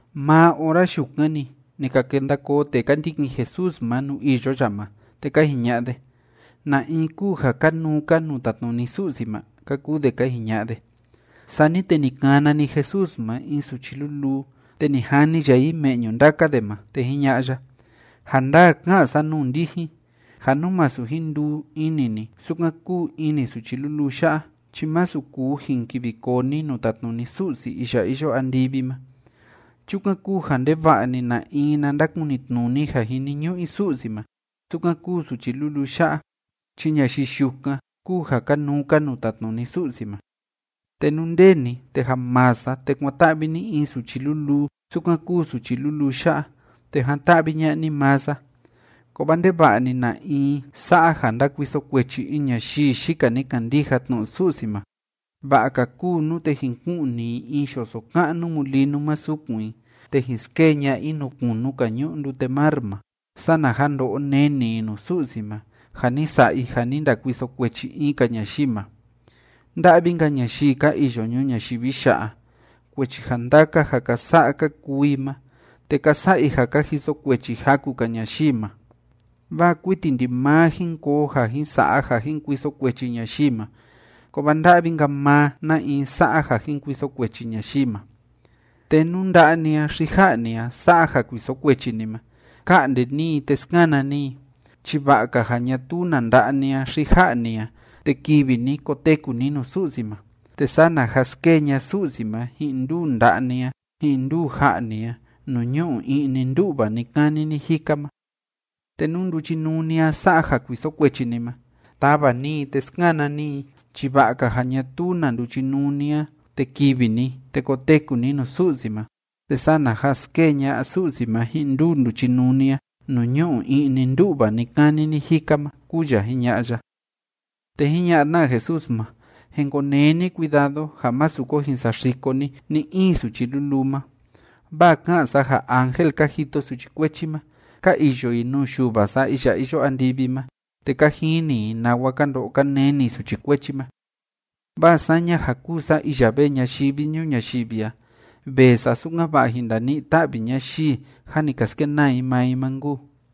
Maa ora yukan‑ni, ni ka kenda koo tee ka ndikin Jesús ma nuu iyo ya ma, te ka jiña'a de: ―¿Na in kúu ja kanuu‑ka nuu tatnuni Su'si ma? ―ka kuu de ka jiña'a de. Sani te ni kana‑ni Jesús ma in suchi luluu, te ni jani ya i me'ñu ndaka de ma, te jiña'a ya: ―Ja ndaa ka'an sa nuu ndijin ja nú masu jin nduu ini ni sukan kúu ini suchi luluu ya'a chi masu kuu jin kivi koo ni nuu tatnuni Su'si iya iyo andivi ma. Chukan kúu ja ndeva'a‑ni na in na ndakunitnuni ja jiniñu'u i Su'si ma sukan kúu suchi luluu ya'a, chi ñayii yukan kúu ja kanuu‑ka nuu tatnuni Su'si ma. Te nú nde ni te ja maa sa, te kuan‑ta'vi ni in suchi luluu sukan kúu suchi luluu ya'a, te jan‑ta'vi ña'a ni maa sa. ’Kovaa ndeva'a‑ni na in sa'a ja ndakuiso kuechi in ñayii yika ni kandija tnu'u Su'si ma, va'a‑ka kúu nute jin ku'ni i in yoso ka'nu mulinu ma sukun i te jin skee ña'a i nuu kunu‑ka ñu'u ndute mar ma, sana ja ndo'o neni i nuu Su'si ma ja ni sa'a i ja ni ndakuiso kuechi in‑ka ñayii ma. ’¡Nda'vi‑nka ñayii ka iyo ñuu ñayivi ya'a, kuechi ja ndaka ja ka sa'a ka kuu i ma, te ka sa'a i ja ka jiso kuechi jaku‑ka ñayii ma! Vaa kuiti ndimaa jin koo ja jin sa'a ja jin kuiso kuechi ñayii ma, kovaa ¡nda'vi‑nka maa na in sa'a ja jin kuiso kuechi ñayii ma! Te nú nda'a ni a xi ja'a ni a sa'a ja kuiso kuechi ni ma, ka'nde ni i te skana ni i, chi va'a‑ka ja ñatuu na nda'a ni a xi ja'a ni a te kivi ni koteku ni nuu Su'si ma, te sana ja skee ña'a Su'si ma ji'in nduu nda'a ni a ji'in nduu ja'a ni a nuu ñu'u i'ni ndú'va ni‑kani ni‑jika ma. Te nú nduchinuu ni a sa'a ja kuiso kuechi ni ma, tava ni i te skana ni i, chi va'a‑ka ja ñatuu na nduchinuu ni a te kivi ni te koteku ni nuu Su'si ma, te sana ja skee ña'a Su'si ma ji'in nduu nduchinuu ni a nuu ñu'u i'ni ndú'va ni‑kani ni‑jika ma ―kúu ya jiña'a ya. Te jiña'a tna Jesús ma: ―Jin konee ni cuidado ja másu ko jin saxiko ni ni‑in suchi luluu ma, vaa ká'an sa ja ángel ka jito suchi kuechi ma, ka iyo i nuu Yuva sa iya iyo andivi ma, te ka jini i nawa ka ndo'o ka neni suchi kuechi ma. Vaa saña ja kúu sa iya vee ñayivi ñuu ñayivi a, vee sa sukan‑va'a jin ndani'i‑ta'vi ñayii jâ ni ka skenaa i maa i ma nkuu.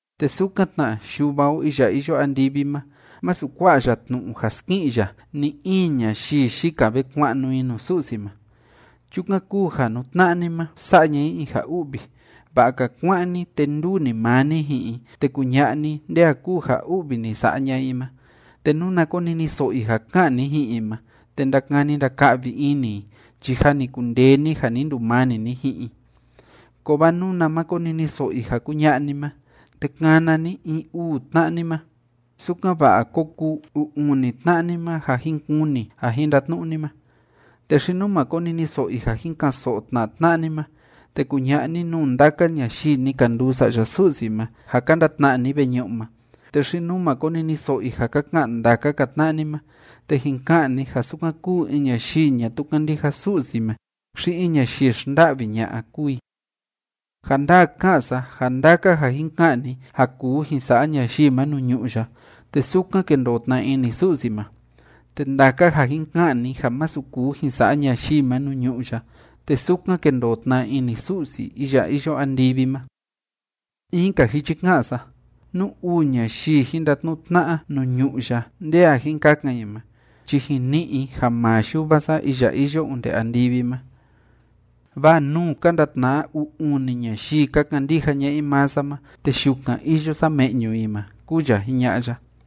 Te sukan tna, Yuva o iya iyo andivi ma, masu kua'a ya tnu'u ja ski'in ya ni‑in ñayii yika ve kua'nu i nuu Su'si ma. ’Chukan kúu ja nú tna'a ni ma sa'a ña'a i in ja u'vi, va'a‑ka kuá'an ni, te nduu‑ni maa ni ji'in i, te kuña'a ni nde a kúu ja u'vi ni sa'a ña'a i ma. Te nuna koniniso'o i ja ka'an ni ji'in i ma te ndakani ndaka'vi ini i chi jâ ni kundee ni ja ni ndumani ni ji'in i. Kovaa nuna ma koniniso'o i ja kuña'a ni ma, te kana ni in uu tna'a ni ma, sukan‑va'a ko kuu uu uni tna'a ni ma ja jin kuni ja jin ndatnu'u ni ma. Te xi nú ma koniniso'o i ja jin ka'an‑so'o tna tna'a ni ma, te kuña'a ni nuu ndaka ñayii ni ka nduu sa'ya Su'si ma, ja ka ndatna'a ni veñu'u ma. Te xi nú ma koniniso'o i ja ka ka'an ndaka‑ka tna'a ni ma, te jin ka'an ni ja sukan kúu in ñayii ñatuu kándija Su'si ma xi in ñayii xnda'vi ña'a kúu i. Ja ndaa ká'an sa ja ndaka ja jin ka'an ni ja kuu jin sa'a ñayii ma nuu ñu'ú ya, te sukan kendoo tna ini Su'si ma, te ndaka ja jin ka'an ni ja masu kuu jin sa'a ñayii ma nuu ñu'ú ya, te sukan kendoo tna ini Su'si iya iyo andivi ma. In‑ka jichi ká'an sa, nú uu ñayii jin ndatnu'u tna'a nuu ñu'ú ya nde a jin kakan i ma, chi jin ni'i i ja maa Yuva sa iya iyo onde andivi ma. Vaa nuu ka ndatna'a uu uni ñayii ka kandija ña'a i maa sa ma, te yukan iyo sa me'ñu i ma ―kúu ya jiña'a ya.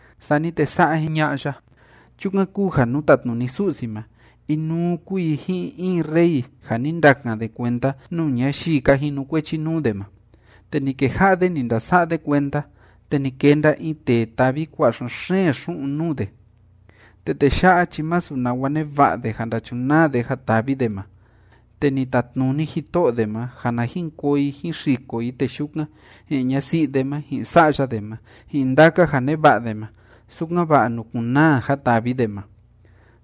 Sani te sa'a jiña'a ya: ―Chukan kúu ja nuu tátnuni Su'si ma, inuu kúu i ji'in in rey ja ni ndakan de kuenda nuu ñayii ka jinukuechi nuu de ma. Te ni keja'a de ni ndasa'a de kuenda, te ni kenda in tee tavi kua'a xen‑xeen xu'un nuu de. Te tee ya'a chi masu nawa neva'a de ja ndachunaa de ja tavi de ma, te ni tatnuni jito'o de ma ja na jin koo i jín xiko i tee yukan, ji'in ñasi'i de ma, ji'in sa'ya de ma, ji'in ndaka ja neva'a de ma, sukan‑va'a nukun‑naa ja tavi de ma.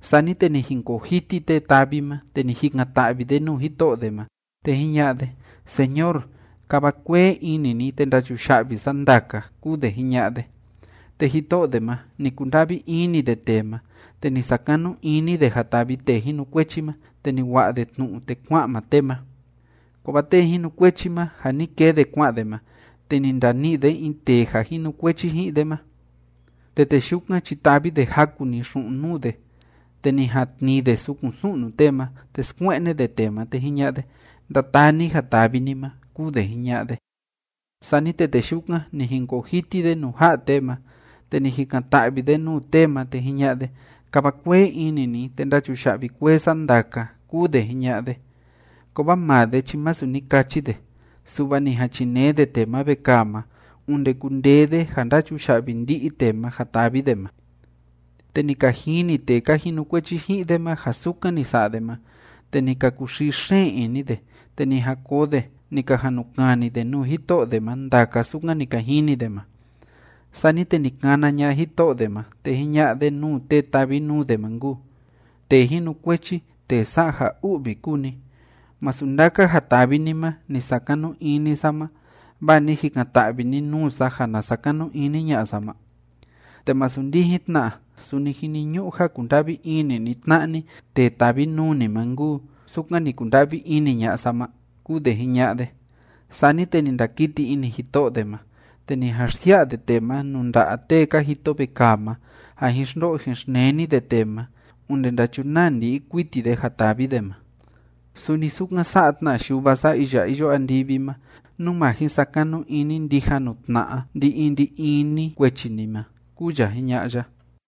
Sani te ni jinkoo jiti tee tavi ma, te ni jikan‑ta'vi de nuu jito'o de ma, te jiña'a de: “Señor, kava kuee ini ni, te ndachuya'vi sa ndaka”, kúu de jiña'a de. Te jito'o de ma, ni kunda'vi ini de tee ma, te ni sakanu ini de ja tavi tee jinukuechi ma, te ni wa'a de tnu'u te kua'an maa tee ma. ’Kovaa tee jinukuechi ma, ja ni kee de kua'an de ma, te ni ndani'i de in tee ja jinukuechi ji'in de ma, te tee yukan chi tavi de jaku‑ni xu'un nuu de, te ni jan tnii de sukun su'nu tee ma, te skue'ne de tee ma, te jiña'a de: “Ndataa ni ja tavi ni ma”, kúu de jiña'a de. Sani te tee yukan, ni jinkoo jiti de nuu ja'a tee ma, te ni jikan‑ta'vi de nuu tee ma, te jiña'a de: “Kava kuee ini ni, te ndachuya'vi kuee sa ndaka”, kúu de jiña'a de. Kovaa maa de chi masu ni kachi de, su'va ni jan chinee de tee ma vekaa ma, onde kundee de ja ndachuya'vi ndi'i tee ma ja tavi de ma. ’Te ni ka jini tee ka jinukuechi ji'in de ma ja sukan ni sa'a de ma, te ni ka kuxii xeen ini de, te ni jan koo de, ni ka jan nu kani de nuu jito'o de ma ndaka sukan ni ka jini de ma. Sani te ni kana ña'a jito'o de ma, te jiña'a de nuu tee tavi nuu de ma nkuu: “Tee jinukuechi tee sa'a ja u'vi kúu ni. ¿Masu ndaka ja tavi ni ma ni sakanu ini sa ma, vaa ni jikan‑ta'vi ni nuu sa ja na sakanu ini ña'a sa ma? ¿Te masu ndijin tna, suni jiniñu'u ja kunda'vi ini ni tna'a ni tee tavi nuu ni ma nkuu, sukan ni kunda'vi ini ña'a sa ma?”, kúu de jiña'a de. Sani te ni ndakiti ini jito'o de ma, te ni jan xsia'a de tee ma nuu nda'a tee ka jito vekaa ma, ja jin xndo'o jin xneni de tee ma onde ndachunaa ndi'i kuiti de ja tavi de ma. Suni sukan sa'a tna Yuva sa iya iyo andivi ma, nú ma jin sakanu ini ndija nuu tna'a ndi‑in ndi‑in ni kuechi ni ma ―kúu ya jiña'a ya.